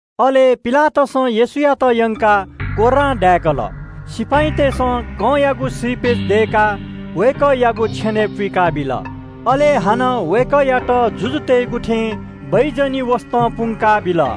अले पिलातसं येशूयात यंकाः कोर्रां दाय्‌कल। सिपाइँतय्‌सं कंयागु श्रीपेच दय्‌काः वय्‌कःयागु छेनय् पुइकाबिल। अले हानं वय्‌कःयात जुजुतय्‌गु थें प्‍याजीगु वसतं पुंका बिल।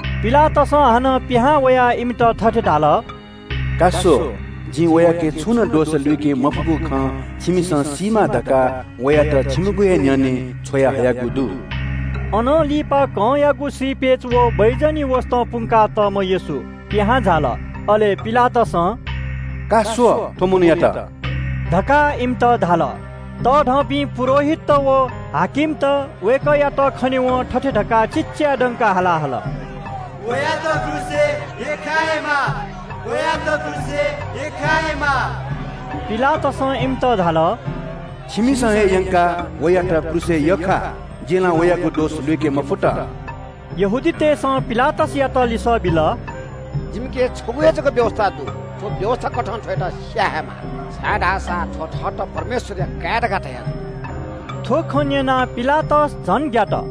पिलातसं हानं पिहां वयाः इमित थथे धाल – “का स्‍व, जिं वयाके छुनं दोष लुइके मफुगु खँ छिमिसं सीमा धकाः वयात छिमिगु हे न्‍ह्यःने छ्वयाहयागु दु।” अनं लिपा कंयागु श्रीपेच व प्‍याजीगु वसतं पुंकातःम्‍ह येशू पिहां झाल। अले पिलातसं – “का स्‍व, थ्‍व मनूयात” धकाः इमित धाल। तःधंपिं पुजाहारीत व देगःया सिपाइँत वय्‌कःयात खनेवं थथे धकाः तस्‍सलं हाला हल – “वयात क्रूसय् यख्‍खायेमाः, वयात क्रूसय् यख्‍खायेमाः।” पिलातसं इमित धाल – “छिमिसं हे यंकाः वयात क्रूसय् यख्‍खा। जिं ला वयागु दोष लुइके मफुत।” यहूदीतय्‌सं पिलातसयात लिसः बिल – “जिमिके नं व्‍यवस्‍था दु, थ्‍व व्‍यवस्‍थाकथं थ्‍वयात स्‍याये हे माः, छाय्‌धाःसा थ्‍वं थःत परमेश्‍वरया काय् धकाः धयाजुल।” थ्‍व खँ न्‍यनाः पिलातस झन ग्‍यात।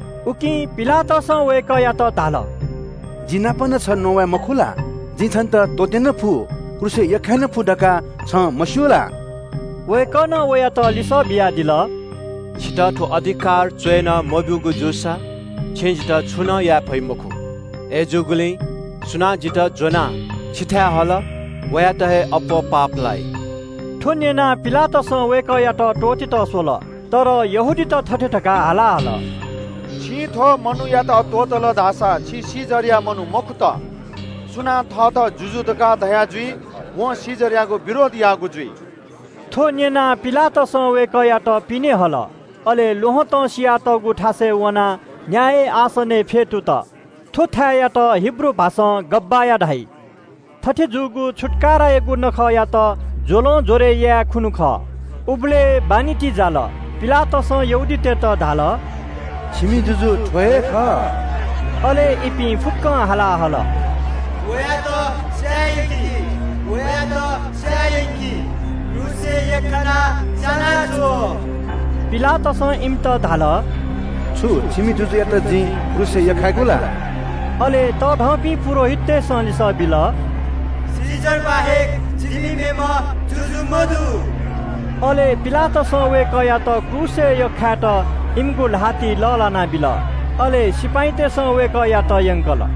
उकिं पिलातसं वय्‌कःयात धाल “जि नाप नं छं नवाये मखु ला? जिं छन्‍त त्‍वःते नं फु, क्रूसय् यख्‍खाये नं फु धकाः छं मस्‍यू ला?” वय्‌कलं वयात लिसः बियादिल – “छितः थ्‍व अधिकार च्‍वय्‌नं मब्‍यूगु जूसा छिं जितः छुं नं याये फइ मखु। अय्‌जूगुलिं सुनां जितः ज्‍वनाः छिथाय् हल, वयात हे अप्‍वः पाप लाइ।” थ्‍व न्‍यनाः पिलातसं वय्‌कःयात त्‍वःतेत स्‍वल। तर यहूदीत थथे धकाः हाला हल – “छिं थ्‍व मनूयात त्‍वःतल धाःसा छि कैसरया मनू मखुत। सुनां थःत जुजु धकाः धया जुइ वं कैसरयागु विरोध याःगु जुइ।” थ्‍व न्‍यनाः पिलातसं वय्‌कःयात पिने हल, अले ल्‍वहँतं सियातःगु थासय् वनाः न्‍याय आसनय् फ्‍यतुत। थ्‍व थाय्‌यात हिब्रू भाषां “गब्‍बथा” धाइ। थथे जूगु छुत्‍काराया नखःयात ज्‍वलं ज्‍वरय् याये खुन्‍हु खः। उबलय् बान्‍हि ति जाल। पिलातसं यहूदीतय्‌त धाल – “छिमि जुजुयात स्‍व।” अले इपिं फुक्‍कं तस्‍सलं हाला हल – “वयात स्‍याये यंकि, वयात स्‍याये यंकि, वयात क्रूसय् यख्‍खानाः स्‍यानाछ्व।” पिलातसं इमित धाल – “छु छिमि जुजुयात जिं क्रूसय् यख्‍खायेगु ला?” अले तःधंपिं पुजाहारीतय्‌सं लिसः बिल – “कैसर स्‍वया जिमि मेम्‍ह जुजु मदु।” अले पिलातसं वय्‌कःयात क्रूसय् यख्‍खायेत इमिगु ल्‍हातिइ लःल्‍हाना बिल। अले सिपाइँतय्‌सं वय्‌कःयात यंकल।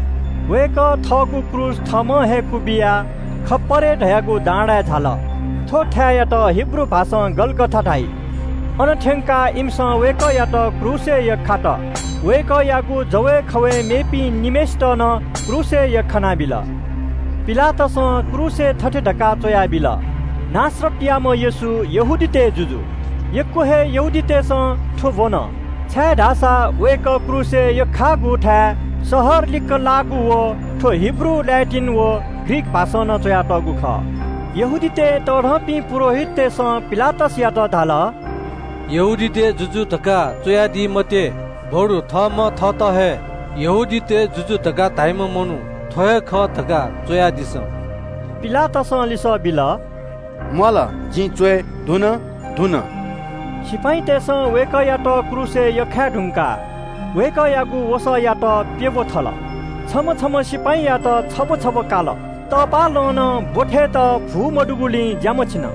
वय्‌कः थःगु क्रूस थःम्‍हं हे क्‍वबिया खप्‍परे धाःगु डाँडाय् झाल। थ्‍व थाय्‌यात हिब्रू भाषां “गलगथा” धाइ। अन थ्‍यंकाः इमिसं वय्‌कःयात क्रूसय् यख्‍खात। वय्‌कःयागु जवय् खवय् मेपिं निम्‍हय्‌सित नं क्रूसय् यख्‍खानाबिल। पिलातसं क्रूसय् थथे धकाः च्‍वयाबिल – “नासरतयाम्‍ह येशू, यहूदीतय् जुजु।” यक्‍व हे मनूतय्‌सं थ्‍व ब्‍वन छाय्‌धाःसा वय्‌कः क्रूसय् यख्‍खाःगु थाय् शहर लिक्‍क लाःगु, व थ्‍व हिब्रू, ल्‍याटिन व ग्रीक भाषां च्‍वयातःगु खः। यहूदीतय् तःधंपिं पुजाहारीतय्‌सं पिलातसयात धाल – “यहूदीतय् जुजु धकाः च्‍वयादी मते, बरु थःम्‍हं थःत हे यहूदीतय् जुजु धकाः धाइम्‍ह मनू थ्‍व हे खः धकाः च्‍वयादिसँ।” पिलातसं लिसः बिल – “म्‍वाःल, जिं च्‍वये धुन।” सिपाइँतय्‌सं वय्‌कःयात क्रूसय् यख्‍खाये धुंकाः वय्‌कःयागु वसःयात प्‍यब्‍व थल। छम्‍ह छम्‍ह सिपाइँनं छब्‍व छब्‍व काल। तपाःलं नं ब्‍वथय्‌त भू मदुगुलिं ज्‍या मछिन।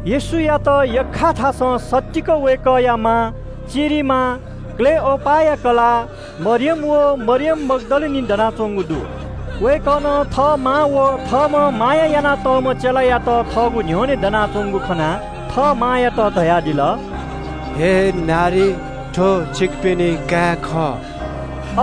येशूयात यख्‍खाःगु थासं सत्तीक वय्‌कःया मां, चिरिमां, क्‍लोपासया कलाः मरियम व मरियम मग्‍दलिनी दनाच्‍वंगु दु। वय्‌कलं थः मां व थःम्‍हं माया यानातःम्‍ह चेलायात थःगु न्‍ह्यःने दनाच्‍वंगु खनाः थः मांयात धयादिल – “अय् नारी स्‍वयादिसँ, थ्‍व छिकपिनि काय् खः।”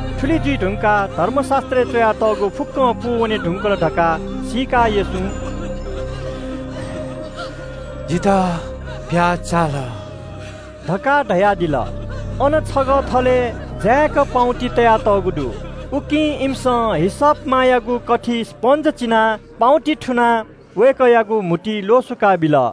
थुलि जुइ धुंकाः धर्मशास्‍त्रय् च्‍वयातःगु फुक्‍कं खँ पूवने धुंकल धकाः सीकाः येशूं “जितः प्‍याः चाल” धकाः धयादिल। अन छगः थलय् जाय्‌क पाउँति तयातःगु दु। उकिं इमिसं हिसप मायागु कथिइ स्‍पन्‍ज चिनाः पाउँतिइ थुनाः वय्‌कःयागु म्‍हुतुइ ल्‍वसुकाबिल।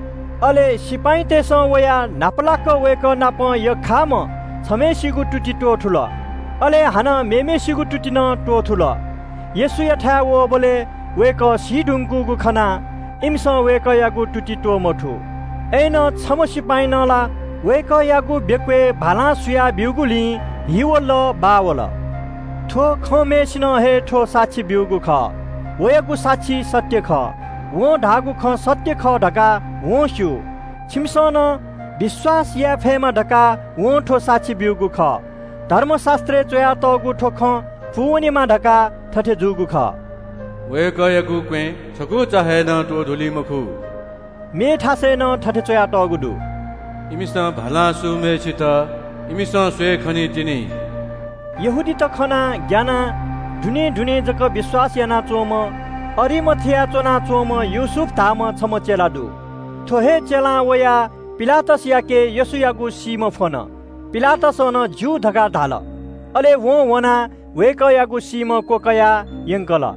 अले सिपाइँतय्‌सं वयाः न्‍हापालाक वय्‌कः नाप यख्‍खाःम्‍ह छम्‍हय्‌सिगु तुति त्‍वथुल, अले हानं मेम्‍हय्‌सिगु तुति नं त्‍वथुल। येशूयाथाय् वःबलय् वय्‌कः सी धुंकूगु खनाः इमिसं वय्‌कःयागु तुति त्‍वमथू। अय्‌नं छम्‍ह सिपाइँनं ला वय्‌कःयागु बेक्‍वय् भालां सुया ब्‍यूगुलिं हि व लः बाः वल। थ्‍व खंम्‍हय्‌सिनं हे थ्‍व साक्षी ब्‍यूगु खः। वयागु साक्षी सत्‍य खः। वं धाःगु खँ सत्‍य खः धकाः वं स्‍यू। छिमिसं नं विश्‍वास याये फयेमा धकाः वं थ्‍व साक्षी ब्‍यूगु खः। धर्मशास्‍त्रय् च्‍वयातःगु थ्‍व खँ पूवनेमा धकाः थथे जूगु खः – “वय्‌कःयागु क्‍वँय् छकुचा हे नं त्‍वधुली मखु।” मेथासय् नं थथे च्‍वयातःगु दु – “इमिसं भालां सूम्‍हय्‌सित इमिसं स्‍वये खनीतिनि।” यहूदीतय् नायःत खनाः ग्‍यानाः दुनें दुनें जक विश्‍वास यानाच्‍वंम्‍ह अरिमाथियाय् च्‍वनाच्‍वंम्‍ह योसेफ धाःम्‍ह छम्‍ह चेला दु। थ्‍व हे चेलां वयाः पिलातसयाके येशूयागु सीम्‍ह फ्‍वन। पिलातसं नं “ज्‍यू” धकाः धाल। अले वं वनाः वय्‌कःयागु सीम्‍ह क्‍वकयाः यंकल।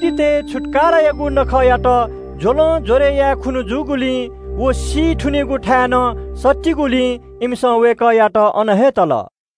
छुत्‍कारायागु नखःयागु छन्‍हु न्‍ह्यः जूगुलिं व चिहान नं नापसं जूगुलिं इमिसं वय्‌कःया सीम्‍हयात अन हे तल।